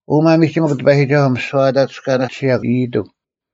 ᐅ ᒪᒥᒋᒥᐧᒄ ᑎᐸᔨᒋᒐᓱᐤ, ᒥᓯᐛ ᐊ ᑕᑐᔅᑲᓇᓯᔭᒄ ᐃᔨᑎᒄ: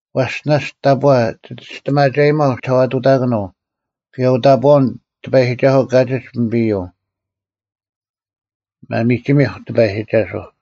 ᐛᔅ ᓇᔅᒡ ᑕᑈ ᒋ ᒋᔅᑎᒪᒐᔨᒪᐤ ᒋᓴᐛᑐᑕᑯᓄᐤ: ᑭᔭ ᐅᑕᑈᐅᓐ ᑎᐸᔨᒋᒐᓱᐤ ᑲᒋᒡ ᐱᒥᐱᔪᐤ᙮ ᒪᒥᒋᒥᐧᒄ ᑎᐸᔨᒋᒐᓱᐤ!